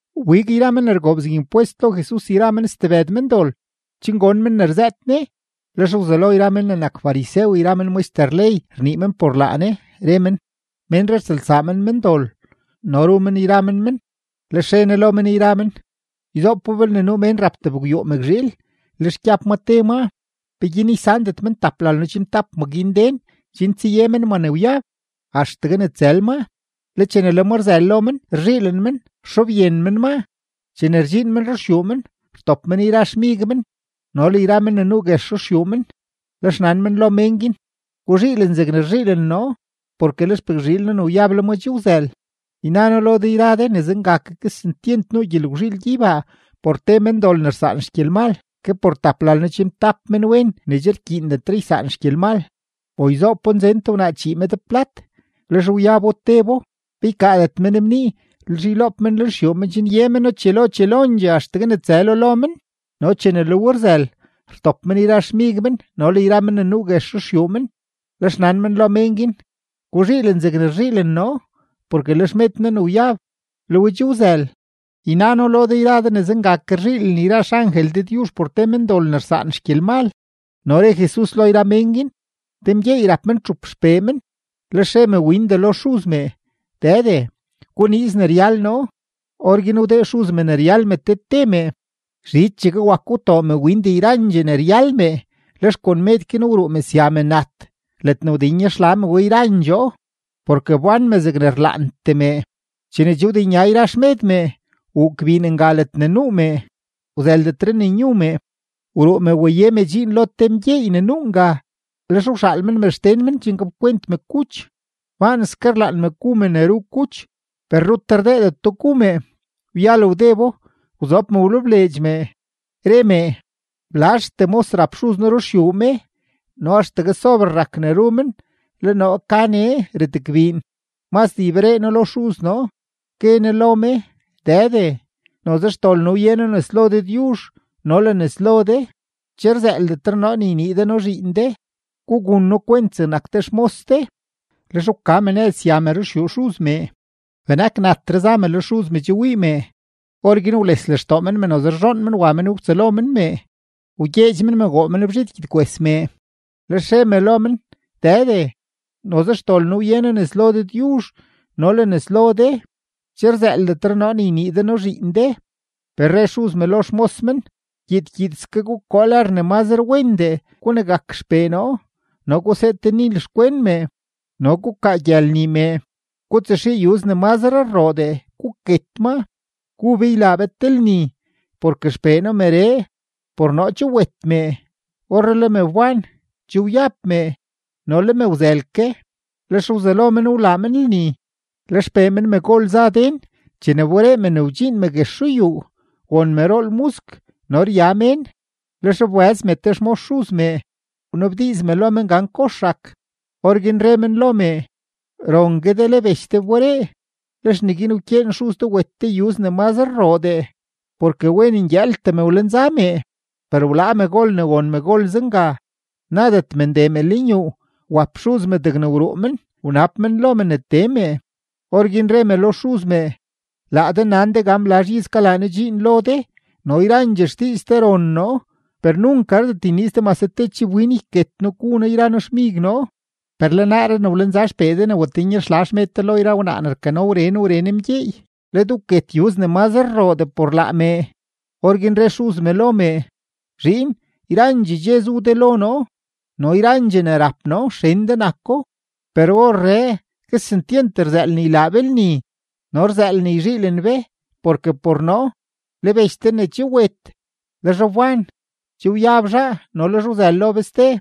Wbig yra men ne rgoob zeg impwest lo Jesus yra men stebëd mendol, chen gon men ne rzëët Ne. Lex wzelo yra men ne nak farisew yra men maxter ley rnii men por laa Ne, re men: ―Ménree rtsëlsaa men mendol no ru men yra men men. Lex re Ne lo men yra men: ―Yzoopo, belne nuu mén rap tebgwyuu mëkzhiil, lex gyab ma te maa. ¿Peguin ysandet men taplalno-chimtap ma guin den chen tsaye men ma ne wyab axtegue ne tsël maa? Le chene le ma rzël lo men, rzhiilen men, rxobyen men maa. Chene rdxiin men ruxyuu men, rtop men yra xmig men no le yra men ne nuu guex ruxyuu men, lex nan men lo mén guin: “Guzhiilen zegne rzhiilen noo, porke le xpëkzhiil noo ne wyab, le ma che wzël.” Yna noo lo de yra de ne zenga ke kesentyent nuu gyelgwzhiil gyeybaa por te mendol ne rsaan xgyelmal, ke por taplalno-chimtap menwen ne che rkyiindetre ysaan xgyelmal. ’O yzoopo, nzen te wnaa chii med plat, lex wyabo tebo. ¿Pe ykaadet men bnii, lex yloob men xyuu men chen ye meno chelo chelondxee axtegue ne tsëlo lo men? No chene le we rzël, rtop men yra xmig men no le yra men ne nuu guex ruxyuu men, lex nan men lo mén guin: “Guzhiilen zegne rzhiilen noo, porke le xmed noo ne wyab, le we che wzël.” Yna noo lo de yra de ne zenga ke rzhiilen yra xangel Dëdyuzh por te mendol ne rsaan xgyelmal. No re Jesus lo yra mén guin: ―Te mgyeey rap men txup xpee men. Lex re mewindee lo xuz mee: “Dëde, guniiz ne ryal noo.” Orguin wdee xuz me ne ryal me te te mee. Zhichegue wako, wtoo mewindee yrandxee ne ryal mee, lex kon med guin wruu me sya me nat ledne wdenyaxla mee we yrandxoo, porke wbán me zegne rlaantee mee. Chene che wdenya yra xmed mee, wuu gbiin nga ledne nuu mee; wzëldetre ne nyu mee. Wruu me waye me dxiin lo te mgyeey ne nuu nga, lex wxaal men me xden men chen gapkwent me kuch. Baanske rlaan me gu me ne ru kuch, per rut rdeedeto gu mee. Wyal wdebo, wzob me wlebleedx mee, re mee: “¡Blazhtee mos rap xuz noo ruxyuu me, no axtegue sober rak ne ru men, le noo ka nee retgbiin! Mazdee yberee noo lo xuz noo, gue noo lo me: Dëde, noze xdol noo wye noo nes lo Dëdyuzh no le nes lo de; che rzëëldetre noo ne ynii de noo zhiin de, gugun noo kwent zegnak te xmos de.” Lex wka me nëz sya me ruxyuu xuz mee. ’Benak natre za mee le xuz mee che wii mee. Orguin wles lextoo men mee, noze rzhoon men wa men wtsëlo men mee, wgyeedx men mee, woo men bzhid gyedkwes mee. Lex re me lo men: “Dëde, noze xdol noo wye noo nes lo Dëdyuzh no le nes lo de; che rzëëldetre noo ne ynii de noo zhiin de.” Per re xuz me lo xmos men: “Gyiid gyiidske gukoo lër ne mazre wendee gunegak xpee noo, no gusee te nil xkwen mee, no gukaa gyël nii mee. Gutsaxii yuz ne mazre rroodee, guket maa. ¡Gu be, ylaa be te lni! Porke xpee noo meree, por noo che wet mee, orree le me wban; che wyab mee, no le me wzël ke.” Lex wzelo men wlaa men lni. ’Le xpee men megol za den; chene wberee me ne wdxiin me guex ruyuu, won me rool musk no rya mén. Lex wbëz me te xmos xuz mee, wnabdiiz me lo men gan kox rak. Orguin re men lo mee: “Rongue de, le bech de wberee; lex neguin wkyeen xuz de wet te yuz ne mazre rroodee, porke wen ngyëëltee me wlenza mee.” Per wlaa megol ne won megol zenga; nadet me ndee me lenyuu. Wap xuz me degne wruu men, wanab men lo me ne tee mee. Orguin re me lo xuz mee: “Laa de nan de gan blazh iz kalaa noo dxiin lo de no yrandxee xdiiz de ron noo, per nunk gardet yniiz de mase te chibwin yket noo gu noo yra noo xmig noo. Per le naaree ne wlenza xpee de ne watenyaxla xmed de lo yra wnaa ne rkano wren wren mgyeey, le de wket yuz ne mazre rroodee por laa mee.” Orguin re xuz me lo mee: “Zhiin, yzaandxee dxe zu de lo noo, no yrandxee ne rap noo, xen de nako. Per orree kesentyent rzëël ne ylaa be lni no rzëël ne yzhiilen be, porke por noo, le bech de ne che wet, le zhaa wban; che wyab zhaa, no le zhaa wzël lo be ste.”